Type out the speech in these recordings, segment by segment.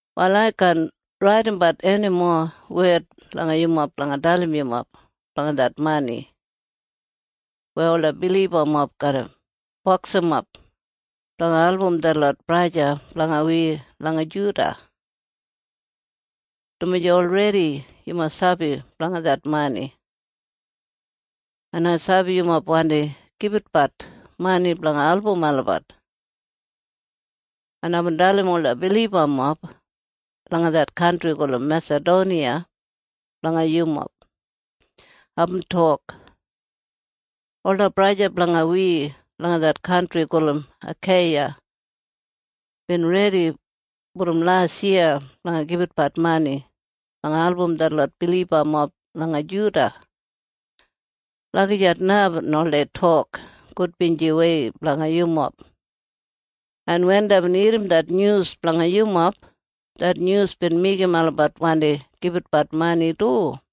Wal ai kaan raidimbat enimo wed langa yumob blanga dalim yumob blanga det mani weya ola bilibamob garra boksimap blanga album detlot braja en sista blanga wi langa Juda, dumaji olredi yumob sabi blanga det mani, en ai sabi yumob wandi gibitbat mani blanga album olabat, en aibin dalim ola bilibamob langa det kantri gulum Mesadoniya blanga yumob. Aibin tok, “Ola braja en sista blanga wi langa det kantri gulum Akeiya bin redi brom lasyiya blanga gibitbat mani blanga album detlot bilibamob langa Juda.” Lagijat na aibin oldei tok gudbinjiwei blanga yumob. En wen deibin irrim det nyus blanga yumob, det nyus bin meigim olabat wandi gibitbat mani du.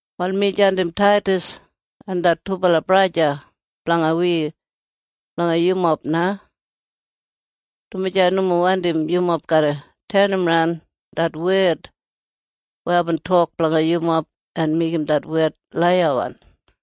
Wal mi jandim Taidas en det dubala braja blanga wi langa yumob na, dumaji ai nomo wandim yumob garra tenimran det wed weya aibin tok blanga yumob en meigim det wed laiyawan.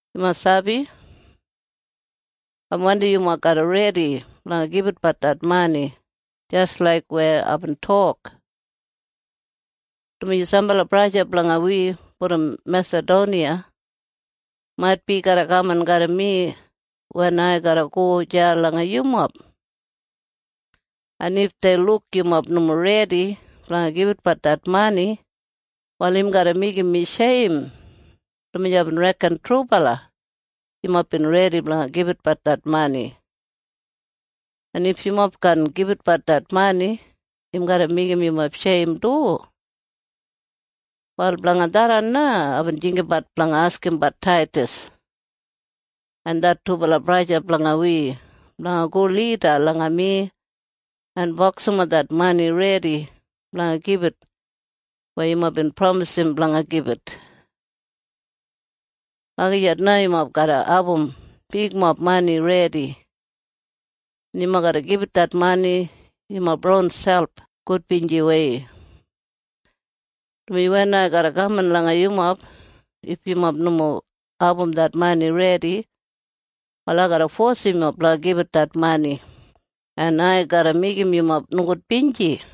Yumob sabi? Ai wandim yumob garra redi blanga gibitbat det mani jis laik weya aibin tok, dumaji sambala braja blanga wi brom Mesadoniya maitbi garra kaman garram mi wen ai garra go deya langa yumob, en if dei luk yumob nomo redi blanga gibitbat det mani, wal im garra meigim mi sheim, dumaji aibin reken trubala yumob bin redi blanga gibitbat det mani. En if yumob kaan gibitbat det mani, im garra meigim yumob sheim du. Wal blanga tharran na aibin jinggabat blanga askimbat Taidas en det dubala braja blanga wi blanga go lida langa mi en boksimap det mani redi blanga gibit weya yumob bin pramis blanga gibit. Lagijat na yumob garra abum bigmob mani redi, en yumob garra gibit det mani yumob ronselp gudbinjiwei, dumaji wen ai garra kaman langa yumob, if yumob nomo abum det mani redi, wal ai garra fosim yumob blanga gibit det mani, en ai garra meigim yumob nogudbinji.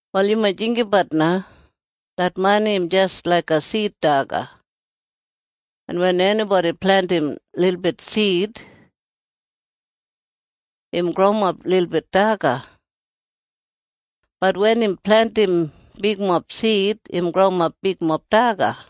Wal yumob jinggabat na. Det mani im jis laiga sid daga. En wen enibodi plentim lilbit sid, im growimap lilbit daga. Bat wen im plentim bigmob sid, im growimap bigmob daga.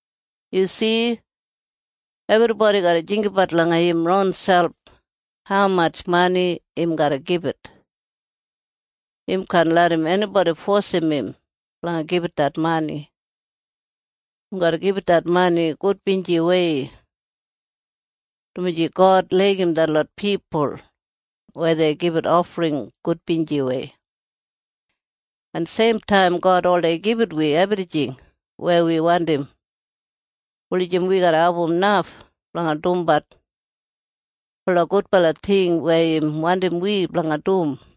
Yu si? Ebribodi garra jinggabat langa im ronselp haumatj mani im garra gibit. Im kaan larram enibodi fosim im blanga gibit det mani. Im garra gibit det mani gudbinjiwei, dumaji God laigim detlot pipul wen dei gibit ofring gudbinjiwei. En seimtaim God oldei gibit wi ebrijing weya wi wandim wulijim wi garra abum naf blanga dumbat ola gudbala ting weya im wandim wi blanga dum.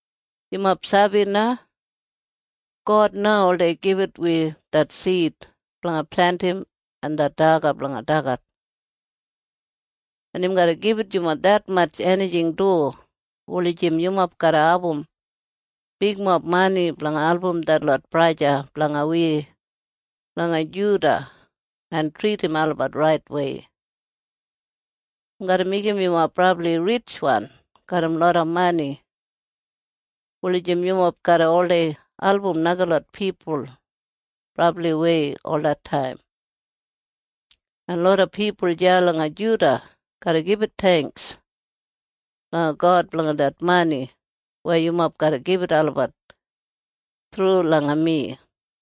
Yumob sabi na? God na oldei gibit wi det sid blanga plentim en det daga blanga dagat. En im garra gibit yumob detmatj enijing du wulijim yumob garra abum bigmob mani blanga album detlot braja en sista blanga wi langa Judiya en tridim olabat raitwei. Im garra meigim yumob brabli ritjwan garram loda mani wulijim yumob garra oldei album najalot pipul brabliwei olataim, en loda pipul deya langa Judiya garra gibit theingks langa God blanga det mani weya yumob garra gibit olabat thru langa mi.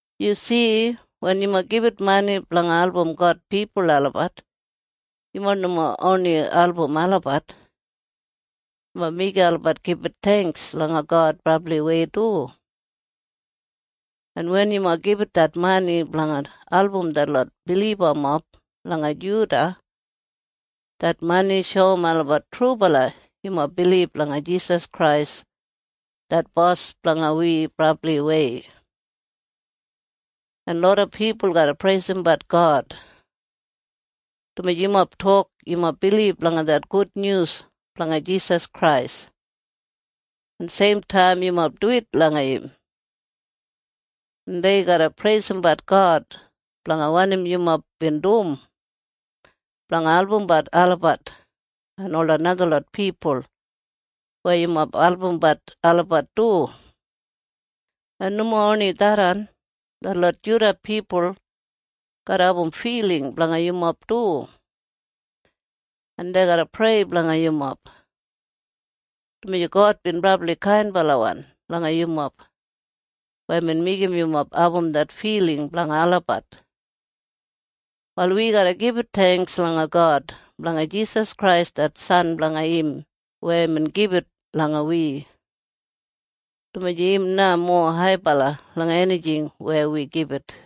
Yu si? Wen yumob gibit mani blanga album God pipul olabat, yumob nomo oni album olabat. Yumob meigim olabat gibit theingks langa God brabliwei du. En wen yumob gibit det mani blanga album detlot bilibamob langa Juda, det mani shoum olabat trubala yumob bilib langa Jisas Krais det Bos blanga wi brabliwei, en loda pipul garra preisimbat God, dumaji yumob tok yumob bilib langa det gudnyus blanga Jisas Krais en seimtaim yumob duwit langa im, en dei garra preisimbat God blanga wanim yumob bin dum blanga albumbat olabat en ola najalot pipul weya yumob albumbat olabat du. En nomo oni tharran. Detlot Judiya pipul garra abum filing blanga yumob du, en dei garra prei blanga yumob, dumaji God bin brabli kainbalawan langa yumob weya imbin meigim yumob abum det filing blanga olabat. Wal wi garra gibit theingks langa God blanga Jisas Krais det san blanga im weya imbin gibit langa wi, dumaji im na mowa haibala langa enijing weya wi gibit.